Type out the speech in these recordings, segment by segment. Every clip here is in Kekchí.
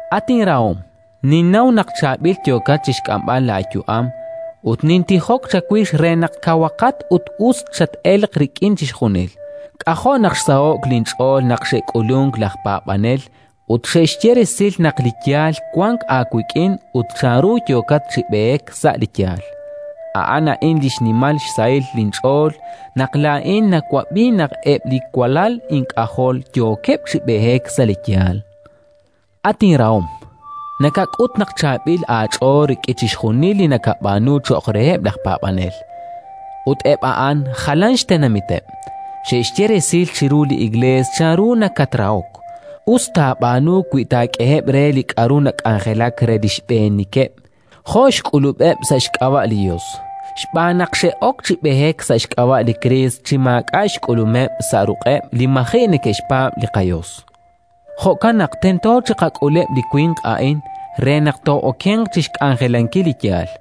At inrahom, ninnaw naq chaab'il yookat chi xk'amb'al laayu'am, ut nintijok chawix re naq kawaqat ut us chat-elq rik'in chixjunil. K'ajo' naq xsaho'k linch'ool naq xe'k'ulunk laj paab'anel ut xe'xye resil naq li yaal wank aawik'in ut chanru yookat chi b'eek sa' li yaal. A'an a'in li xnimal xsahil linch'ool: naq laa'in nawab'i naq eb' li walal ink'ajol yookeb' chi b'eek sa' li yaal. At inrahom, nakak'ut naq chaab'il aach'ool rik'in chixjunil li nakab'aanu cho'q reheb' laj paab'anel: ut eb' a'an jalan xtenamiteb'! Xe'xye resil chiru li Iklees chanru nakatrahok. Us taab'aanu wi taak'eheb' re li k'aru nak'anjelak re li xb'eenikeb', jo' xk'ulub'eb' sa' xk'ab'a' li Yos. Xb'aan naq xe'ok chi b'eek sa' xk'ab'a' li Kriist chi maak'a' xk'ulumeb' sa' ruq'eb' li maji' neke'xpaab' li qaYos. Jo'kan naq tento chiqak'uleb' li winq a'in re naq too'okenq chi xk'anjelankil li yaal.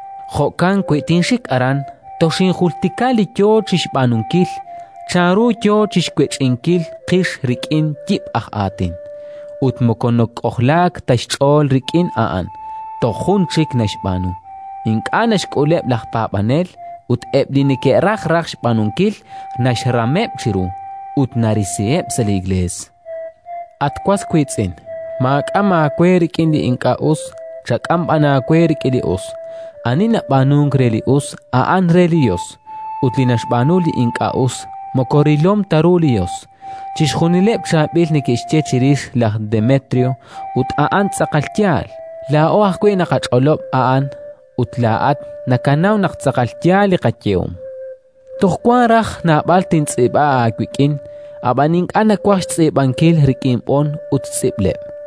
Jo'kan wi tinxik aran, toxinjultika li yo chi xb'aanunkil, chanru yo chi xwech'inkil qix rik'in yib' aj aatin. Ut moko nak'ojlaak ta xch'ool rik'in a'an, toj jun chik naxb'aanu: ink'a' naxk'uleb' laj paab'anel; ut eb' li neke'raj raj xb'aanunkil naxrameb' chiru, ut narisiheb' sa' li Iklees. At inrahom, maak'am aawe rik'in li ink'a' us, chak'am b'an aawe rik'in li us. Ani nab'aanunk re li us, a'an re li Yos; ut li naxb'aanu li ink'a' us, moko rilom ta ru li Yos. Chixjunileb' chaab'il neke'xye chirix laj Demetrio, ut a'an tz'aqal yaal. Laa'o ajwi' naqach'olob' a'an, ut laa'at nakanaw naq tz'aqal yaal li qayehom. Toj wank raj naab'al tintz'iib'a aawik'in, ab'an ink'a' nawaj xtz'iib'ankil rik'in b'on ut tz'iib'leb'.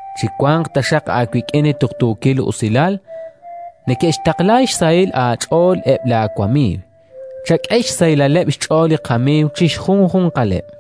Chiwanq taxaq aawik'in li tuqtuukil usilal. Neke'xtaqla xsahil aach'ool eb' laawamiiw. Chak'e xsahilaleb' xch'ool li qamiiw chi xjunjunqaleb'.